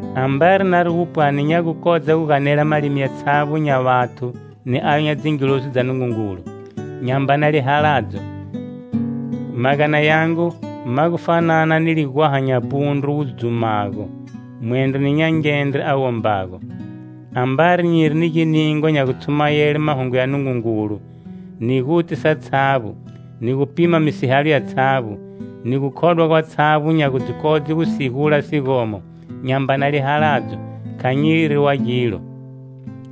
Ambari nari gu pwani nya gu kodza gu ganela malimi yatshavbo nya vathu ni ayo nya dzilozi dza Nungungulu, nyambana lihaladzo, magana yangu ma gu fanana ni ligwaha nya pundru wu dzumago, mwendro ni nyangendre a wombago. Ambari nyiri ni giningwa nya gutshumayele mahungu ya Nungungulu, ni guti satshavbo, ni gupima misihalo yatshavbo, ni gukhodwa gwatshavbo nya gu dzi kodze gu sigula sigomo, nyambana lihaladzo, kha nyiri wa gilo.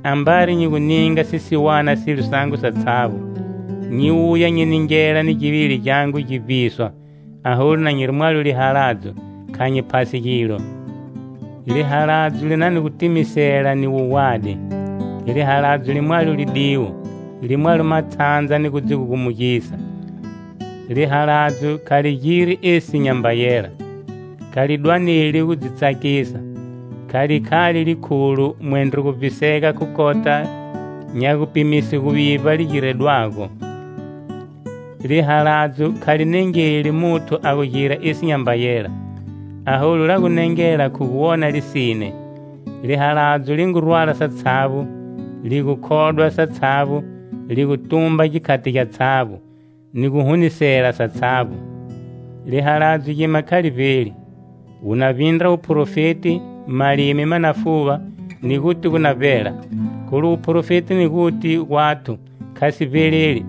Ambari nyi gu ninga sisiwana silo sangu satshavbo, nyi wuya nyi ningela ni givili gyangu gi vbiswa, aholu na nyiri mwalo lihaladzo, kha nyi phasi gilo. Lihaladzo li na ni gutimisela ni wuwadi. Lihaladzo li mwalo lidiwo, li mwalo matshandza ni gu dzi gugumugisa. Lihaladzo kha li giri esi nyamba yela, kha li dwaneli gu dzi tsakisa, kha li khali likhulo, mwendro gu vbisega khu kota nya gupimise guvivba li giredwago. Lihaladzo kha li nengeli muthu a gu gira esi nyamba yela, aholu la gu nengela khu gu wona lisine. Lihaladzo li ngu rwala satshavbo, li gukhodwa satshavbo, li gu tumba gikhati gyatshavbo ni guhunisela satshavbo. Lihaladzo gima kha li vbeli. Wu na vbindra wuprofeti, malimi ma na fuva, ni guti gu na vbela. Kholu wuprofeti ni guti gwathu kha si vbeleli.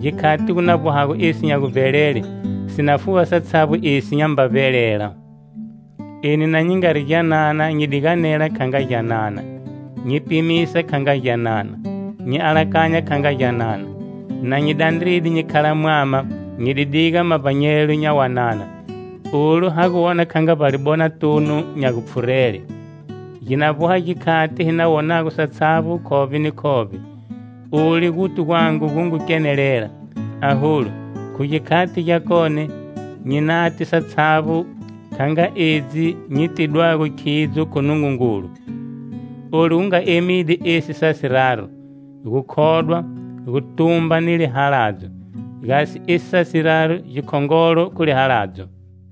Gikhati gu na vbohago esi nya guvbelele, si na fuva satshavbo esi nyamba vbelela. Eni na nyi ngari gyanana nyi di ganela kha nga gyanana, nyi pimisa kha nga gyanana, nyi alakanya kha nga gyanana. Na nyi dandride nyi khala mwama, nyi di diga mavbanyelo nya wanana. Olu ha gu wona kha nga vbalibonatunu nya gupfhurele; gi na vboha gikhati hi na wonago satshavbo khovbe ni khovbe. Olu guti gwangu gu ngu kenelela, aholu, khu gikhati gyakone nyi nati satshavbo kha nga edzi nyi tidwago khidzo khu Nungungulu. Olu gu nga emide esi sa siraru: Gukhodwa, Gutumba ni Lihaladzo. Ga esi sa siraru gikhongolo khu lihaladzo.